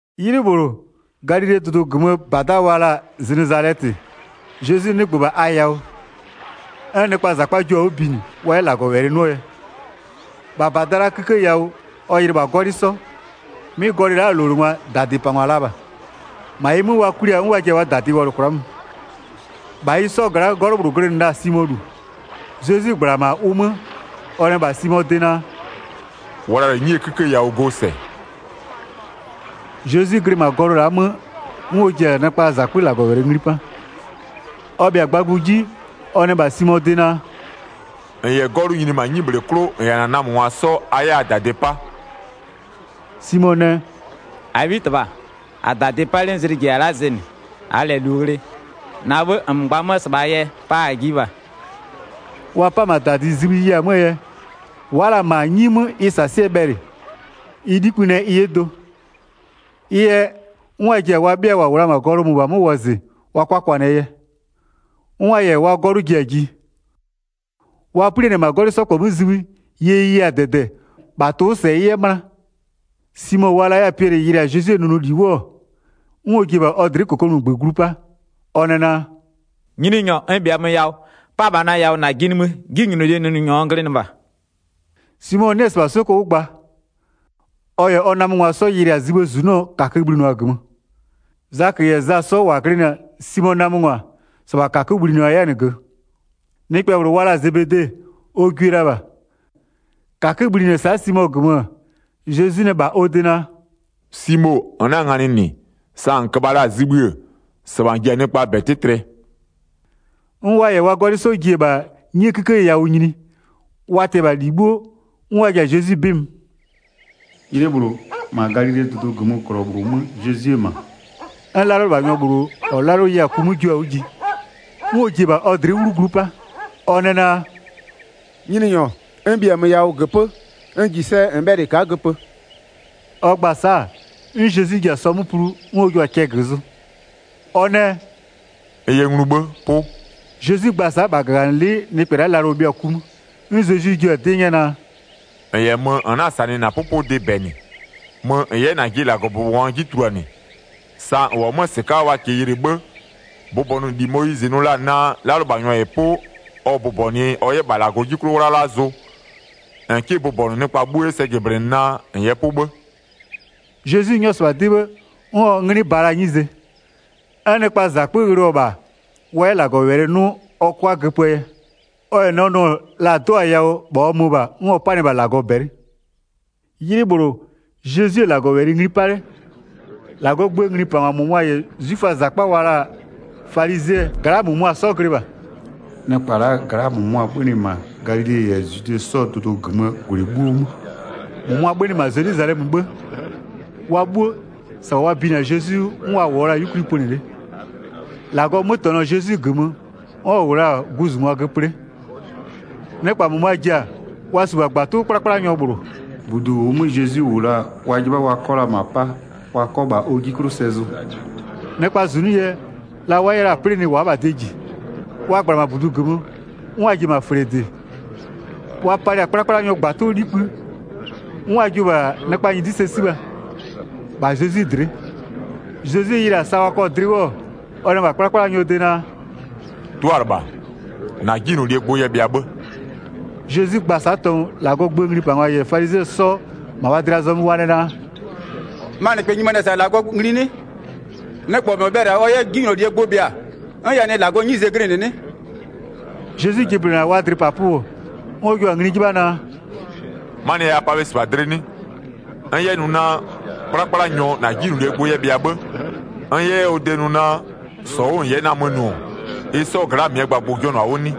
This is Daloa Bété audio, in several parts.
'Ylɩ -bhlʋ Galilee dʋdʋ -gömöö -bada wa la-a Zenezalɛtɩ, Zezwi 'nɩgbö -bha a yawʋ 'n nɩkpaa -zakpa jio-a 'wʋ binɩ wa 'yɛ -Lagɔwɛlɩ 'nʋɔ yɛ. 2-Bha -bada la'aa 'kïkë yawʋ ɔ yɩlɩ -bha 'gɔlɩ 'sɔ. 'Mɩ gɔlɩ la'aa -lowlengwa -dadɩpangwa la -bha. -Ma ɩ 'mö wa kwli-a 'n wa ji-a wa -dadɩ wɔlʋ kwla'a mö. 3-Bha ɩ 'sɔ gla'aa 'gɔlʋ -bhlʋ glɩnɩ la-a Simoo -lu. Zezwi -gbla-a -ma ʋ 'mö-ö, ɔ nɛ -bha Simoo de naa: “Wla -lɛ 'nyie 'kïkë yawʋ go sɛ.” Zezwi glɩ -ma gɔlʋ la'aa 'mö 'n ɔ ji-a nɩkpaa -zakpö -Lagɔwɛlɩ ngli 'pa. Ɔ bhɩa-a gbagbʋ 'ji, ɔ nɛ -bha Simoo de naa: “-N -yɛ 'gɔlʋ nyini -ma 'nyibhle 'klʋ -n -yɛ -na namöngwa 'sɔ a 'yɛ a -dadɩ 'pa.” Simo nɛ: “-Abhitɩbha, -a-a -dadɩ -pa 'le 'n zlɩ -jiya-a la'a zɩnɩ, -aa -lɛ -lu ghlɩ. -Na 'bhë -nmö gba 'mö-ö -sɩbhaa yɛ pa -a jiɩ -bha.” Wa 'pa-a -ma -dadɩ zibhï ɩ ye-a 'möö yɛ, wa'a la -ma 'nyi 'mö ɩ -sasɩɛ bhɛlɩ, ɩ 'likpï nɛ ɩ 'yɛ do. Ɩ yɛ 'n wa ji-a wa 'bhɩa -wa -wʋ la-a -ma gɔlʋ -mʋbhaa 'mö wɔzɩ wa 'kʋa 'kwanɩɛ yɛ. 'N wa -yɛ wa 'gɔlʋ ji-a ji. Wa 'plianɩ-ɛ -ma 'gɔlɩ 'sɔ -kpɔ 'mö zibhï, ye ɩ ye-a -dɛdɛ, -bha tʋ-ʋ 'wʋ -sɛ ɩ 'yɛ 'möna. Simo wa la 'yɛ-a Piɛlɩ yɩlɩ-a Zezwie nʋnʋli 'wʋ-ɔ, 'n ɔ ji-e -bha ɔ dlɩ'ɩ -kokomunigbö glu 'pa, ɔ nɛ naa: “Nyininyɔ, n -bhiamö yawʋ, 'pa -bha na yawʋ -najɩ nimï, 'jinylolie nʋnʋnyɔ n glɩnɩ -bha.” Simo 'nɩ-ɛ -sɩbha 'soko 'wʋ gba. Ɔ -yɛ ɔ namöngwa 'sɔ wa yɩlɩ-a zibhïë -zunɔ -kakö-ö bhlinʋa-a -gömö. Zakö -yɛ Za 'sɔ -wa glɩnɩ-a Simoo namöngwa, -sɩbha -kakö bhlɩnʋa 'yɛ-a -nɩ -gömö. Nɩkpɛ -bhlʋ wa la-a Zebede ɔ gwie la -bha. -Kakö bhlinɩ-ɛ sa'a Simo -gömö, Zezwi nɛ -bha ɔ de naa: “Simo, -n na-a nganɩ -nɩ sa -n köbha la-a zibhï-ë, -sɩbha -n ji-a nɩkpaa -bɛ 'tɩtlɩɛ.” 'N wa -yɛ wa 'gɔlɩ 'sɔ ji-e -bha 'nyie 'kïkë yawʋ nyini, wa tɩ-ɛ -bha -li 'bhuo, 'n wa ji-a Zezwi 'bɩ mö. 'Ylɩ -bhlʋ, -ma Galilee dʋdʋ -gömöö -glɔ -bhlʋ 'mö Zezwi-e -ma, 'n 'lalʋlɩbhanyɔ -bhlʋ -ɔ 'lalʋ ye-a ku 'mö jio-a 'wʋ ji. 'N ɔ ji-e -bha ɔ dlɩ'ɩ 'wlu glu 'pa, ɔ nɛ naa: “Nyininyɔ, n -bhiamö yawʋ -göpö'ö, n -ji sɛ -n bhɛlɩ n ka'a göpö.” Ɔ gba-a sa'a, 'n Zezwi ji-a sɔ 'mö plu 'n ɔ jio-a cɛ zʋ. Ɔ nɛ: “N yɛ nglu 'bhë, 'pʋ!” Zezwi gba-a sa'a, -bha -gaganɩlɩ'ɩ nɩkpɛ la'a lalʋ-ʋ bhɩɔ-a ku 'mö. 'N Zezwi jio-a 'dɩ 'nyɛ naa: “-N -yɛ mö, -n 'na-a -sanɩ -na 'pʋpʋdɩ -bɛ -nɩ. Mö -n 'yɛ -najɩ -Lagɔbʋbɔnyɔ 'ji tuluanɩ, sa -n -wʋ-ɔ 'mö-ö -sɩka'a ɔ -kɩɩ yɩlɩ 'bhë, bʋbɔnʋli Moyizɩ nʋ la-a naa 'lalʋlɩbhanyɔ -yɛ 'pʋ ɔ bʋbɔnʋɩ ɔ 'yɛ -bha -Lagɔ 'ji 'klʋ 'wlala zʋ, -n 'kɩ bʋbɔnʋ nɩkpa 'bhuo 'yɛ sɛ jɩblɩnɩ naa -n yɛ 'pʋ 'bhë.” Zezwi 'nyɔ-ɔ -sɩbha 'dɩ 'bhë, 'n ɔ 'nglɩ ba la-aa 'nyize. 'N nɩkpaa -zakpö ghlɩɔ-ɔ -bha wa 'yɛ -Lagɔwɛlɩ 'nʋ ɔ 'kʋa 'yɛ göpöö yɛ. Ɔ -yɛ nɛ nʋ-ɔ, la-a 'do-a yawʋ -bha ɔ mö -bha, 'n ɔ 'panɩ-ɛ -bha -Lagɔ -bɛlɩ. 'Ylɩ -bhlʋ, Zezwi-e -Lagɔwɛlɩ ngli 'pa 'le, -Lagɔɔ gböö nglipangwa -mʋmʋa -yɛ 'zwiföaa -zakpa -ma wa la-a falizɩɛ gla'aa -mʋmʋa 'sɔ glɩ -bha. Nɩkpa la'aa gla'aa -mʋmʋa 'bhönɩ -ma Galile -yɛ Zwide 'sɔɔ dʋdʋ -gömöö -gwlɩ 'bhuo 'mö, -mʋmʋa 'bhönɩ -ma Zelwizalɛmöö 'bhë. Wa 'bhuo, -sɩbha wa binɩ-a Zezwi 'wʋ n wa -wʋɔ la-a 'yukwli pönɩ 'le. -Lagɔɔ 'mötɛnɔ-ɔ Zezwi -gömö 'n ɔ -wʋ la-a guzungwa göpö 'le. Nɩkpa -mʋmʋa ji-a, wa -su -bha -gbatʋ 'wʋ 'kplakplanyɔ -bhlʋ. -Budu -ʋʋ 'mö Zezwi -wʋ la-a wa 'jɩbha wa 'kɔ la -ma 'pa wa 'kɔ -bha ɔ 'ji 'klʋ sɛ zʋ. Nɩkpaa -zunʋ yɛ, la wa 'yɛ la planɩ wa'a -bha de -ji. Wa -gbla-a -ma -budu -gömö, 'n wa ji-e -ma -fle -dɩ, wa palɩ-a 'kplakplanyɔɔ -gbatʋ 'likpï, 'n wa jio-o -bha nɩkpa -nyɩdɩ sɛ 'sibha, -bha Zezwi dlɩ'ɩ. Zezwi yɩlɩ-a sa wa kɔ-a dlɩ 'wʋ-ɔ, ɔ nɛ -bha 'kplakplanyɔɔ de naa: “'Tʋalɩbha, -na 'jinylolie gbʋ yɛ bhɩa 'bhë.” Zezwi gba-a sa'a tɔngʋ, -Lagɔɔ gböö nglipangwa -yɛ falizɩɛ 'sɔ -ma wa dlɩa zɔmö wa nɛ naa: “Ma -nɩkpɛ nyimanɩ-ɛ -sa -Lagɔ ngli 'nɩ? Nɩkpɛ -mɔ bhɛlɩ-a ɔ 'yɛ 'jinylolie gbʋ bhɩa 'n ɛ nɩ -Lagɔɔ 'bhëë 'nyize glɩnɩ 'nɩ?” Zezwi jɩblɩnɩ-a wa dlɩpapʋ, 'n ɔ jua-a ngli 'jɩbha naa: “'Manɩɛ yɛ a pa bhe -sɩbha dlɩ 'nɩ? N 'yɛ nʋ naa: 'Kplakplanyɔ -na 'jinylolie gbʋ yɛ bhɩa 'bhë, n 'yɛ 'yɛ ɔ de nʋ naa: -Sɔ 'wʋ -n 'yɛ namö nʋ-ɔ, ɩ 'sɔɔ gla'a -mɩɛ gbagbʋ-ʋ jɔnʋ-a 'wʋ 'nɩ?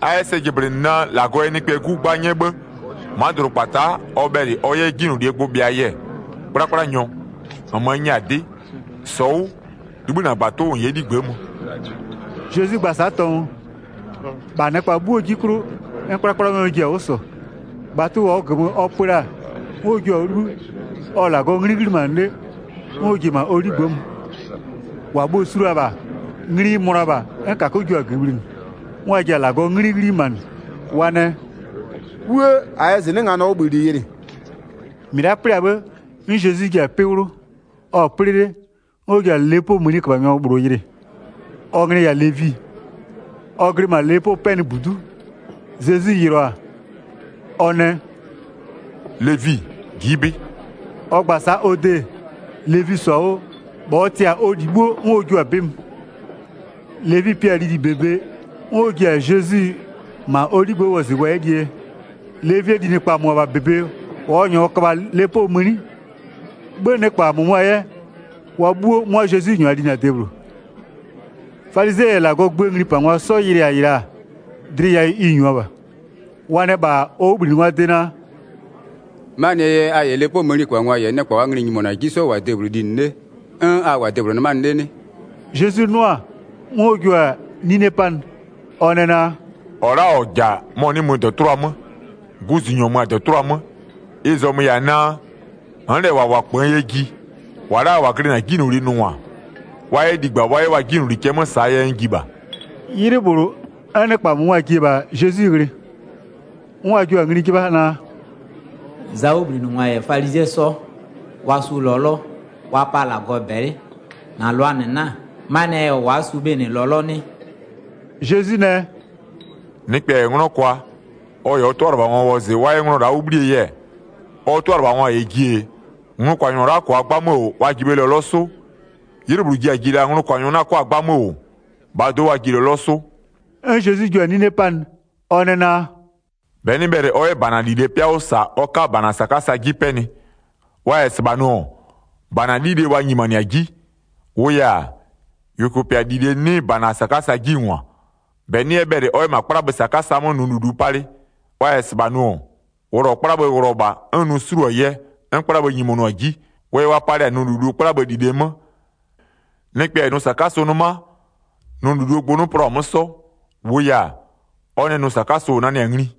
A 'yɛ sɛ jɩblɩnɩ naa: -Lagɔ yɛ Nɩkpɛɛ 'Gu 'gba 'nyɛ 'bhë, ma'a dʋdʋkpata'a ɔ bhɛlɩ ɔ 'yɛ 'jinylolie gbʋ bhɩaa yɛ, 'kplakplanyɔ, -nmö n nyɛ-a 'dɩ, -sɔ 'wʋ, 'libhï -na -gbatʋ 'wʋ -n 'yɛ 'ligbë'ë mö.” Zezwi gba-a sa'a tɔngʋ, -bha nɩkpa 'bhuoo 'ji 'klʋ 'n 'kplakplanyɔ ji-a 'wʋ -sɔ, -gbatʋ -ʋʋ -gömö ɔ pö la-a, 'n ɔ jiʋ-a 'wʋ 'libhï, ɔ-ɔ -Lagɔɔ 'nglɩ 'ghlimanɩ 'le 'n ɔ ji-e -ma ɔ 'ligbë'ë mö. 26-Wa bhuo-o su la-a -bha, ngli-i mönʋa-a 'n -kakö jua-a -gömö bhlinɩ. 'N wa ji-a -Lagɔɔ 'nglɩ 'ghlimanɩ, wa nɛ: “'Wuë! -A yɛ -zɩnɩ'ɩ nganɔɔ 'wʋbhïli yɩlɩ.” Zezwi yɛ Levi wɔzɩ ɔ -nyɔɔ 'yɛ 'wʋ -bhlinɩɛ yɛ 27-Mɩ la'a 'plɩ-a 'bhë, 'n Zezwi ji-a 'pɩ 'wlʋ, ɔ-ɔ 'plɩ 'le, 'n ɔ ji-a lepoo mëniköbhanyɔ -bhlʋ yɩlɩ, ɔ nglɩ-ɩ -yɛ-a Levi, ɔ glɩ -ma lepopɛnɩbudu'u, Zezwi yɩlɩɔ-a, ɔ nɛ, “Levi, ji'i 'bɩ.” Ɔ gba-a sa'a ɔ de, Levi -sɔ-a 'wʋ, -bha ɔ tɩ-a ɔ -li 'bhuo 'n ɔ jio-a 'bɩ mö. Levi pi-a lili -bebe, 'n ɔ ji-a Zezwi -ma ɔ 'ligbë'ë wɔzɩ wa 'yɛ lie yɛ. Levie linɩkpa -mʋmʋaa -bebe -wa ɔ -nyʋa köbha-a lepoo mëni, 'bhë nɩkpa -mʋmʋa 'yɛ, wa 'bhuo 'mʋa Zezwi -nyʋa linɩ-a debhlʋ. Falizɩɛ -yɛ -Lagɔɔ gböö nglipangwa 'sɔ yɩlɩ-a -ɩ la'a, dlɩ yawʋ ɩ -nyua -bha. Wa nɛ -bha ɔ 'wʋbhlinɩngwaa de naa: “'Manɩɛ yɛ a -yɛ lepoo mëniköbhangwa -yɛ nɩkpa -waa nglɩ-ɩ nyimonʋ-a 'ji 'sɔ -wʋ-a debhlʋ linɩ 'le 'n a -wʋ-a debhlʋ 'nɩmanɩ 'le 'nɩ?” Zezwi 'nʋ-a, 'n ɔ jua-a 'nine 'panɩ, ɔ nɛ naa: “-Ɔ la'a -ɔ -ja-a, mɔ-ɔ 'nɩ mö -dɔtʋlʋa 'mö, guzunyɔ mö-a -dɔtʋlʋa 'mö. Ɩ zɔmö-ö -yɛ-a naa: N'n -lɛ -wa -wʋ-a -kpöön yɛ ji. -Wa la'a -wa glɩnɩ-a 'jinylolie nʋngwa, wa 'yɛ ligba wa 'yɛ wa 'jinyloli cɛ 'mö -saa yɛ n ji -bha.” 'Ylɩ -bhlʋ, 'n nɩkpa -mʋmʋa ji-e -bha Zezwi ghlɩ, 'n wa jio-a ngli 'jɩbha naa: “Zaa 'wʋbhlinɩngwa -yɛ falizɩɛ 'sɔ, wa sʋ lɔlɔ, wa pa -Lagɔ -bɛlɩ, na -lʋaa -nɩ 'na-a? Manɩɛ yɛ wa'a 'sʋ bhe -nɩ lɔlɔ 'nɩ?” Zezwi nɛ: “Nɩkpɛ -yɛ 'nglɔ kwa, ɔ -yɛ ɔ 'tʋalɩbhangwa wɔzɩ wa 'yɛ nglɔ la'a 'wʋ 'bhlie yɛ, ɔ 'tʋalɩbhangwa -yɛ ji-e, nglʋkwanyɔ la'a -kʋa 'gbamö -wʋ, wa ji bhe lɔlɔ 'sʋ? 'Ylɩ -bhlʋ ji ji la nglʋkwanyɔ 'na 'kʋa-a 'gbamö -wʋ, -bhaa do'o wa ji lɔlɔ 'sʋ.” 'N Zezwi jua-a 'nine 'panɩ. Ɔ nɛ naa: “-Bɛ 'nɩ bhɛlɩ ɔ 'yɛ -bana -lilee 'pɩa 'wʋ -sa wa 'ka -bana -sakasa 'ji 'pɛnɩ. Wa -yɛ -sɩbha nʋ-ɔ, -bana 'lile wa nyimanɩ-a 'ji. -Wʋʋ yɛ-a, -yʋkʋpɩa -lile 'nɩ -bana -sakasa 'ji -ngwa. 37-Bɛ 'nɩ 'yɛ bhɛlɩ ɔ 'yɛ -ma 'kplabhë -sakasa 'mö nʋ -lulu palɩ. Wa -yɛ -sɩbha nʋ-ɔ, wʋlɔ 'kplabhë wʋlɔ -bha 'n nʋ 'suluo-a yɛ 'n 'kplabhë nyimonʋ-a 'ji. Wʋ yɛ wa palɩ-a nʋ -lulu 'kplabhë -lile 'mö. Nɩkpɛ -yɛ nʋ -sakasʋ 'nɩma, nʋ -luluo gbʋ 'nɩ plɔ-a 'mö 'sɔ. -Wʋʋ yɛ-a ɔ nɛ nʋ -sakasʋ-ʋ nanɩ-a ngli.”